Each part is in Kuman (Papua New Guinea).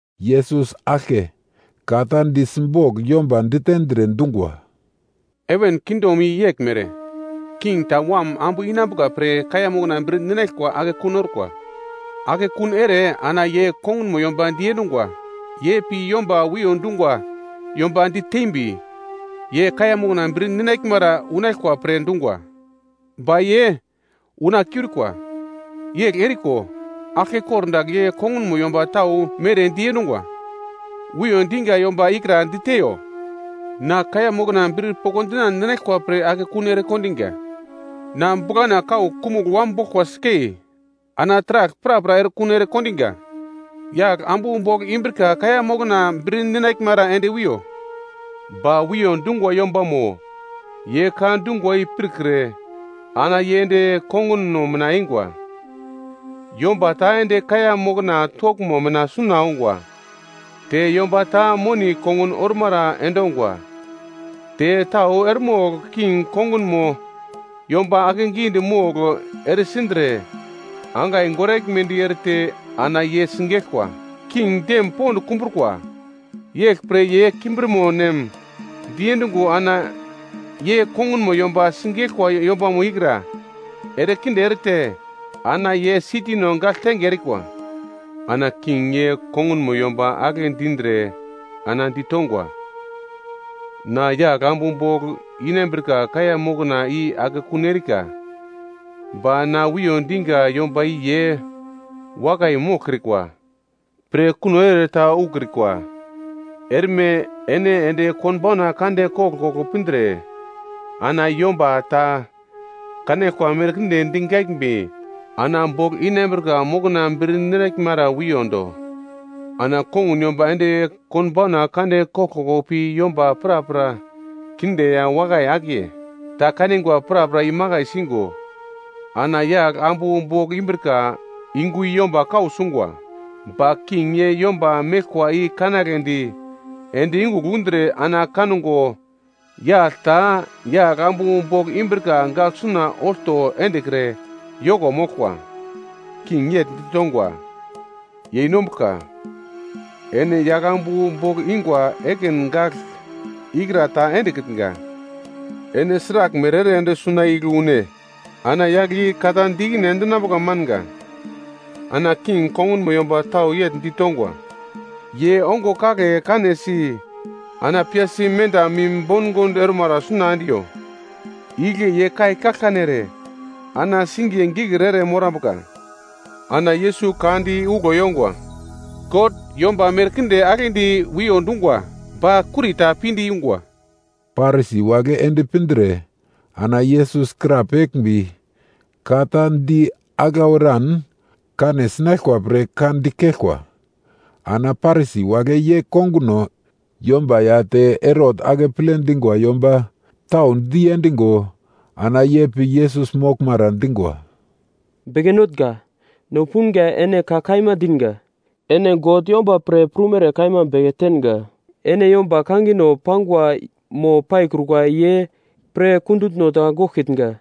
Yesus aglke ka ta di simbogl yomba ditendre dungwa, “Heven kingdom i yeglmere, king ta wam ambu inambuka pre kaiya mokna bir ninaglkwa akekun orkwa. Akekun ere ana ye kongunmo yomba diendungwa. Ye pi yomba wiyo dungwa yomba ditembi, ye kaiya mokna bir ninaglmara unaglkwa pre dungwa. Ba ye una kiurikwa. “Yegl eriko aglke kordagl ye kongunmo yomba tau mere diende dungwa, ‘Wiyo diga yomba ikra diteiyo, na kaiya mokna bir pokndinan ninaglkwa pre akekun ere kondiga. Na buglana kau kumugl wam boglkwa sikei, ana taragl prapra erekuno ere kondinga. Yagl ambu bogl inambrika kaiya mokna bir ninaglmara ende wiyo.’ “Ba wiyo dungwa yombamo, ye ka dungwa i pirkre ana ye ende konguno mina eingwa. Yomba ta ende kaiya mokna toglmo mina suna ongwa, te yomba ta moni kongun ormara endongwa. Te tau eremogl king kongunmo yomba akegidi mogl ere sindre, angai goraglmedi erete, ana ye sigeglkwa. King dem pond kumbrukwa, yeglpre ye kimbirmo nem diendungo ana ye kongunmo yomba sigeglkwa yombamo ikra, erekinde erete ana ye sitino gagltenge erikwa. “Ana king ye kongunmo yomba agle dindre ana ditongwa, ‘Na yagl ambu bogl inambrika kaiya mokna i akekun erika. Ba na wiyo diga yomba i ye wakai moglkrikwa pre kuno ere ta ukrikwa. Erme ene ende konbauna kande koglkoglo pindre ana yomba ta kanaglkwa merkinde digaglmbi ana bogl inambrika mokna bir ninaglmara wiyondo.’ Ana kongun yomba ende konbauna kande koglkoglo pi yomba prapra kinde ya wakai akiye ta kanigwa prapra imakai singo ana yagl ambu bogl imbrika yungu i yomba kau sungwa. “Ba king ye yomba meglkwa i kanagledi ende yungugl undre ana kango yagl ta yagl-ambu bogl imbrika gagl suna olto endekre yoko moglkwa. King yegl ditongwa, ‘Yeinombuglka, ene yaglambu bogl ingwa ekin gagl ikra ta endekitnga, ene sraglmere ere ende suna igle une?’ Ana yagle i ka ta di ikine endinambuka manga. “Ana king kongunmo yomba tau yegl ditongwa, ‘Ye ongo kagle kanesi ana piyasi menda mim bongond ormara suna endiyo. Igle ye kai kaglkane ere ana singiye gikir ere morambuka.’” Ana Yesus ka di uglo yongwa, “God yomba merkinde aglendi wiyo dungwa, ba kurita pinde yungwa.” Parisi wagle ende pindre ana Yesus krapeglmbi ka ta di aglau eran kane sinaglkwa pre ka dikeglkwa. Ana Parisi wagle ye konguno yomba ya te Herot akeple dingwa yomba tau diendigo, ana ye pi Yesus moglmara dingwa, “Beke notnga, no punga ene ka kaima dinga. Ene God yomba pre prumere kaima beke tenga, ene yomba kangino pangwa mo paikrukwa ye pre kundutno ta goglkitnga.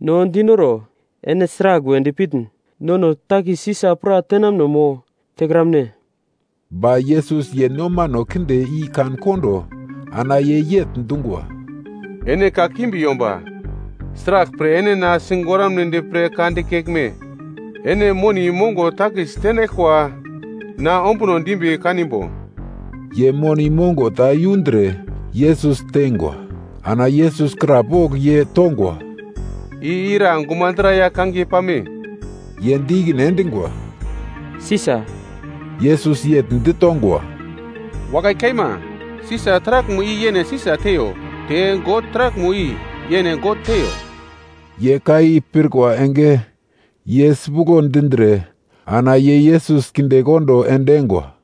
No dinoro, ene sragl we dipitn? Nono takis Sisa pra tenamuno mo tekramne?” Ba Yesus ye nomano kinde i kan-kondo ana ye yegl dungwa, “Ene kakimbi yomba, sraglpre ene na sigoramnedi pre ka dikeglme? Ene moni mongo takis tenaglkwa na ombuno dimbi kanimbo?” Ye moni mongo ta yundre Yesus teingwa. Ana Yesus krapogl ye tongwa, “I ira gumadra ya kangiye pame?” Ye di ikine endingwa, “Sisa.” Yesus yegl ditongwa, “Wakai kaima, Sisa taraglmo i yene Sisa teiyo, te God taraglmo i yene God teiyo.” Ye ka i pirkwa enge, ye sipuglo dindre ana ye Yesus kindekondo endingwa.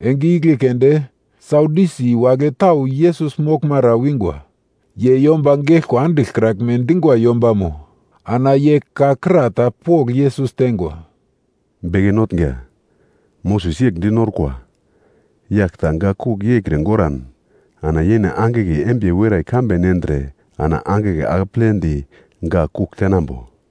Enge igle keunde Sadyusi wagle tau Yesus moglmara wingwa. Ye yomba geglkwa andiglkraglme dingwa yombamo, ana ye ka kra ta pogl Yesus tengwa, “Beke notnga, Moses yegl dinorkwa, yagl ta gak kugl yeikre goran, ana yene angigle embiye werai kambe nendre ana angigle akepledi gak kugl tenambo.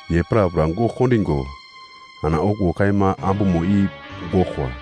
Ye prapra gogl kondingo ana okuwo kaima ambumo i goglkwa.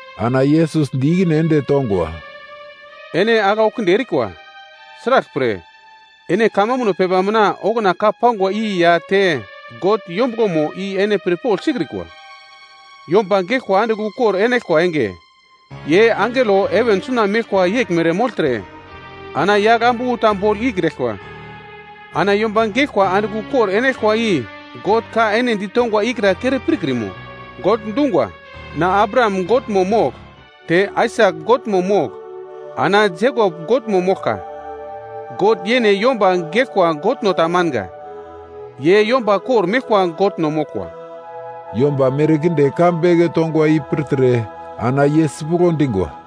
Ana Yesus di ikine ende tongwa, “Ene aglau kinde erikwa; sraglpre, ene kamambuno pepa mina okuna ka pangwa i ya te God yombuglomo i ene pirpogl sikrikwa. Yomba geglkwa andigl ukor enaglkwa enge, ye angelo heven suna meglkwa yeglmere mogltre ana yagl ambu ta bogl ikraglkwa. Ana yomba geglkwa andigl ukor enaglkwa i God ka ene ditongwa ikra kere pirkrimo? God dungwa, ‘Na Abraham Godmo mogl, te Aisak Godmo mogl, ana Jekop Godmo moglkwa.’ God ye yomba geglkwa Godno ta manga. Ye yomba kor-meglkwa Godno moglkwa.” Yomba merkinde ka beke tongwa i pirtre ana ye sipuglo dingwa.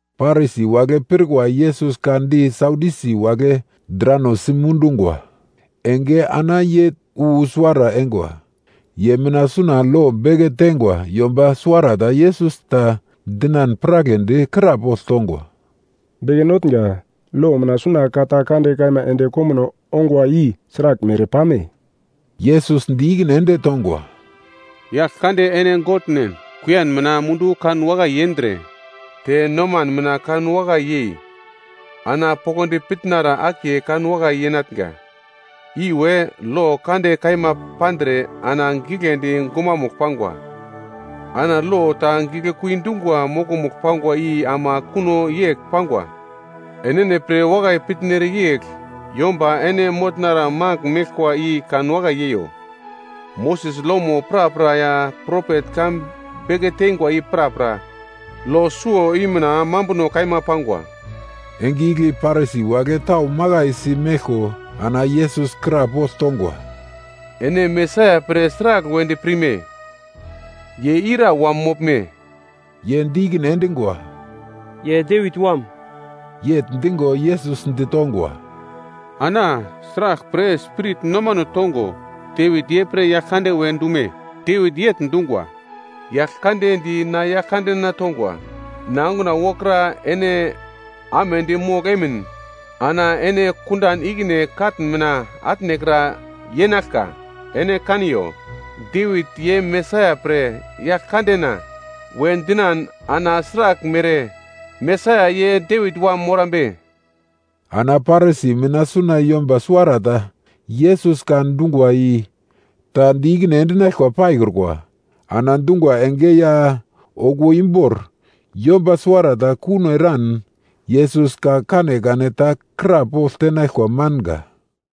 Parisi wagle pirkwa Yesus ka di Sadyusi wagle drano simundungwa enge ana ye wu suwara eingwa. Ye mina suna lo beke teingwa yomba suwarata Yesus ta dinan piragledi krapogl tongwa, “Beke notnga, lo mina suna ka ta kande kaima ende komuno ongwa i sraglmere pame?” Yesus di ikine ende tongwa, “‘Yaglkande ene Godnen, kuiyan mina mundu kan wakai yendre, te noman mina kan wakai yei, ana poglodi pitnara akiye kan wakai yenatnga.’ Iwe lo kande kaima pandre ana giglendi gumamugl pangwa. Ana lo ta giglekui dungwa mokomugl pangwa i ama kuno yegl pangwa, ‘Enene pre wakai pitnere yegl yomba ene motnara magl meglkwa i kanwakai yeiyo.’ Moses lomo prapra ya propet ka beke teingwa i prapra, lo suwo i mina mambuno kaima pangwa.” Enge igle Parisi wagle tau makaisi meglko ana Yesus krapogl tongwa, “Ene Mesaia pre sragl wedi pirme? Ye ira wam moglme?” Ye di ikine endingwa, “Ye Devit wam.” Yegl dingo, Yesus ditongwa, “Ana sraglpre Spirit nomano tongo, Devit ye pre Yaglkande we dume? Devit yegl dungwa, “‘Yaglkande di na Yaglkandena tongwa, “Na onguna wokra ene amedi mogl emin, ana ene kundan ikine katn mina atnekra yenaglka.” ’ Ene kaniyo, Devit ye Mesaia pre ‘Yaglkandena’ we dinan, ana sraglmere Mesaia ye Devit wam morambe?” Ana Parisi mina suna yomba suwarata Yesus ka dungwa i ta di ikine endinaglkwa paikrukwa, ana dungwa enge ya okuwo imbor yomba suwarata kuno eran Yesus ka kanekane ta krapogl tenaglkwa manga.